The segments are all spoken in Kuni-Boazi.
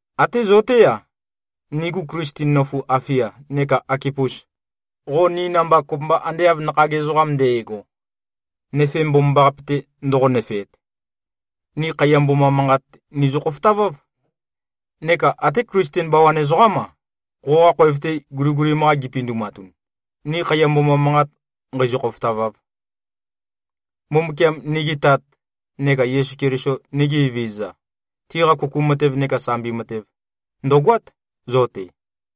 Até zo-té-a, nigu Klisten nøfu Afia, neka Akipus, qo ni namba kopømba ande av nakhag ezoqam nde꞉go, nøfe mbomambaqape-te ndoqo-nøfeap, ni khaiya mboma manqat nizø-khofotaváv. Neka até Klisten bawan ezoqám-a, qoqa khoev-te guligulim-qa gipindumatun, ni khaiya mboma manqat nqēīzø̄-khōfōtāvāv. Mbumbukiam, nigi Tat, neka Yesu Keliso, nigi Evezøza, tiqa kuku matev neka sambi matev, ndø̀goát, zo-te.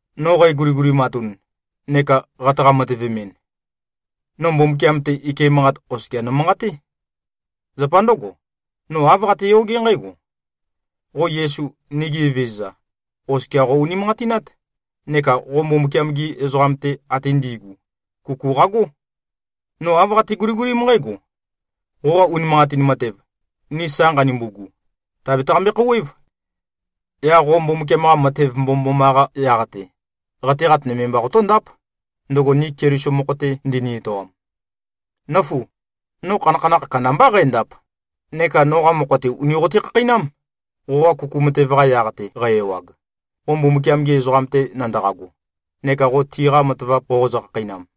No qæguligulimatun neka qataqa-matøvemɨn, no Mbumbukiam-te, ike manqat oskia nomanqaté. Zapa ndǿgo, no āv qateyogé nqǽgo: Qo Yesu, nigi Evezøza, oskia qo-unimanqatinát neka qo Mbumbukiam-gi ezoqam-te ate ndi꞉gu, kuku qagó. No āv qate-guligulím nqǽgo: Qoqa unimanqatin matev, ni sa nqanumbugu, tàbetaqambe-khouwév. Yaq qo Mbumbukiam-qa matev mbomømboma-qa yaq-te, qateqat nøme mba qotóndáp, ndøgo ni Keliso mokho-te ndini-etoam. Nǿfu! No khanakhanakh kandambá qændap, neka noqa mokho-te, ùni qote-khakheinám, qoqa kuku matev-qa yaq-te qæ-ewag, qo Mbumbukiam-gi ezoqam-te nandaqago, neka qo tiqa matavap qoqozø-khakheinam.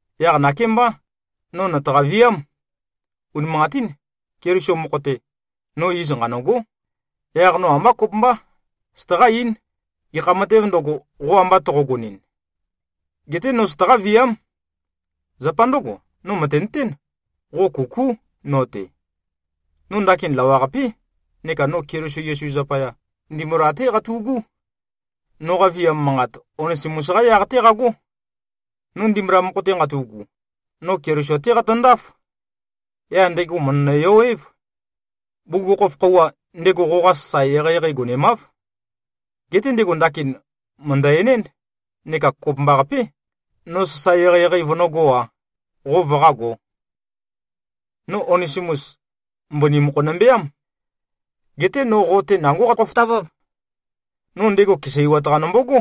Yaq nakémbá, no nøtaqa-viám. Unimanqatín, Keliso mokho-te, no iz nqanø̂gó. Yaq no ambá kopømbá, sataqá-eín, gekha matēv ndøgo, qo amba toqogonɨn. Geté no sataqá-viám. Zapa ndǿgo, no mø̀tenøtén, qo kukú no-te. No ndakin lawaqapé neka no Keliso Yesu zapaya, ndimbula-té qatu꞉gú. Noqa viam manqat, Onesimus-qá yaq-té qagó. No ndimbula mokho-te nqatu꞉gu, no Keliso-té qatøndáf. Yaq ndego mø̀ndønø-yo-év. Bugukhokhof khøuwa, ndego qoqa sasae eqeieqei gonemáv. Geté ndego ndakin mø̀ndø-enénd, neka kopømbaqapé, no sasae eqeieqei vønǿgō-a, qo vøqágō. No Onesimus, mbøni mokho nømbeám. Geté no qo-te nangó qatø-khofotaváv. No ndego keseiwat-qa nombogó.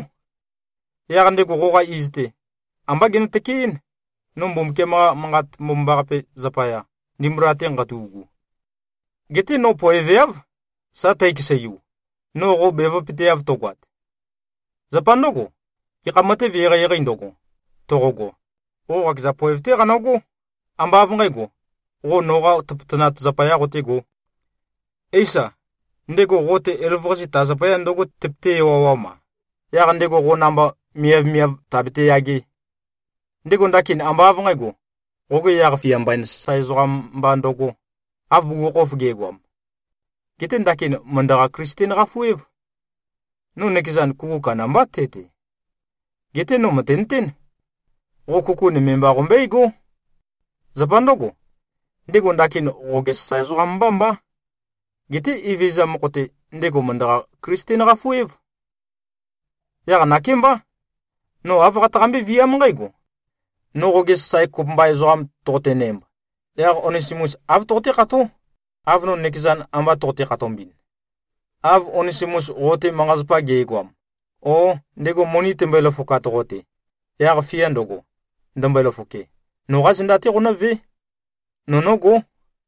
Yaq ndego qoqa iz-te, ambá genø-tøkeɨ́n, no Mbumbukiam-qa Manqat Mbomambaqape zapaya, ndimbula-te nqatu꞉gu. Geté no poeveáv, sa tækeseiu, no qo bevøpøteav tøgoat. Zapa ndǿgo, gekha matev eqeieqeī ndøgo, toqogo, qo qakeza poev-té qanøgó, ambá av nqǣgo, qo noqa tøpøtøqat zapayā qotégō. Éisa, ndego qo-te elavøqase ta zapaya ndǿgo tøpøté-ewawam-a, yaq ndego qo namba miavmiav tàbete-yagē? Ndego ndakin ambá av nqǣgo, qoge yaq-fia mbain sasae ezoqam mba ndøgō, av bugukhokhof ge꞉goam. Geté ndakin mø̀ndøqa-Klisten-qafu-év. No nøkezan, kuku kandambá te-te. Geté no mø̀tenøtén. Qo kuku nøme mba qombøégó. Zapa ndǿgo, ndego ndakin qoge sasae ezoqam mbá mbá. Geté Evezøza mokho-te, ndego mø̀ndøqa-Klisten-qafu-év. Yaq nakémbá, no āv qataqambé-viám nqǽgo: No qoge sasae kopømba ezoqam toqotenæmb, yaq Onesimus āv toqoté-kható, av no nøkezan amba toqote-khatombɨn. Av Onesimus qo-te manqa-zapa ge꞉goam, o ndego moni timbøe-løfokat qo-te, yaq fia ndøgo, ndømbøe-løfoke, noqá zenda-té qonǿvé. No nógó.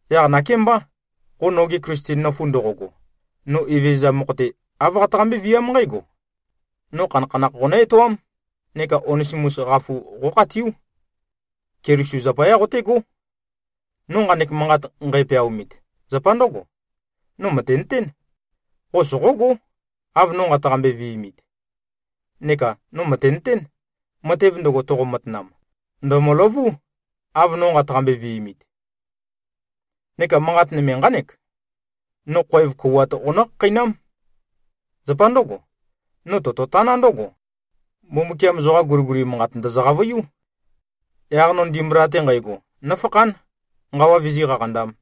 Yaq nakémbá, qo noge Klisten nøfu ndoqogo, no Evezøza mokho-te, āv qataqambé-viám nqǽgo: No khanakhanakh qonǿ-etoám neka Onesimus qafu qókhatiú. Keliso zapayá qotégó. No nqanek manqat nqæpeaomit, zapa ndǿgo: No mø̀tenøtén, qo soqógó, av no nqataqambe-vi꞉mit. Neka no mø̀tenøtén, matev ndøgo toqo-matanam, ndø̀møløvú, av no nqataqambe-vi꞉mit. Neka manqat nøme nqánek: No khoev kouwat qonǿ-khakheinám. Zapa ndǿgo, no tototaná ndǿgo: Mbumbukiam zoqa guliguli manqat ndø̀zø-qavøiú. Yaq no ndimbula-te nqægo, nófakhán, nqawa vizí-qaqandām.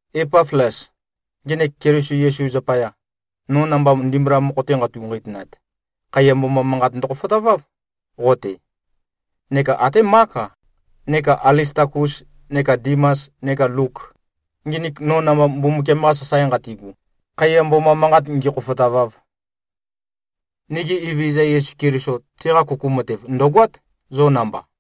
Epaflas, ngenek Keliso Yesu zapaya, no namba ndimbula mokho-te nqeitu-nqeitønat, khaiya mboma manqat ndøkhofotaváv, qo-te. Neka até Mák-a, neka Alistakus neka Dimas neka Luk, nginik no namba Mbumbukiam-qa sasae nqatigu, khaiya mboma manqat ngīkhōfōtāvāv. Nigi Evezøza Yesu Keliso, teqa kuku matev, ndø̀goát, zo namba.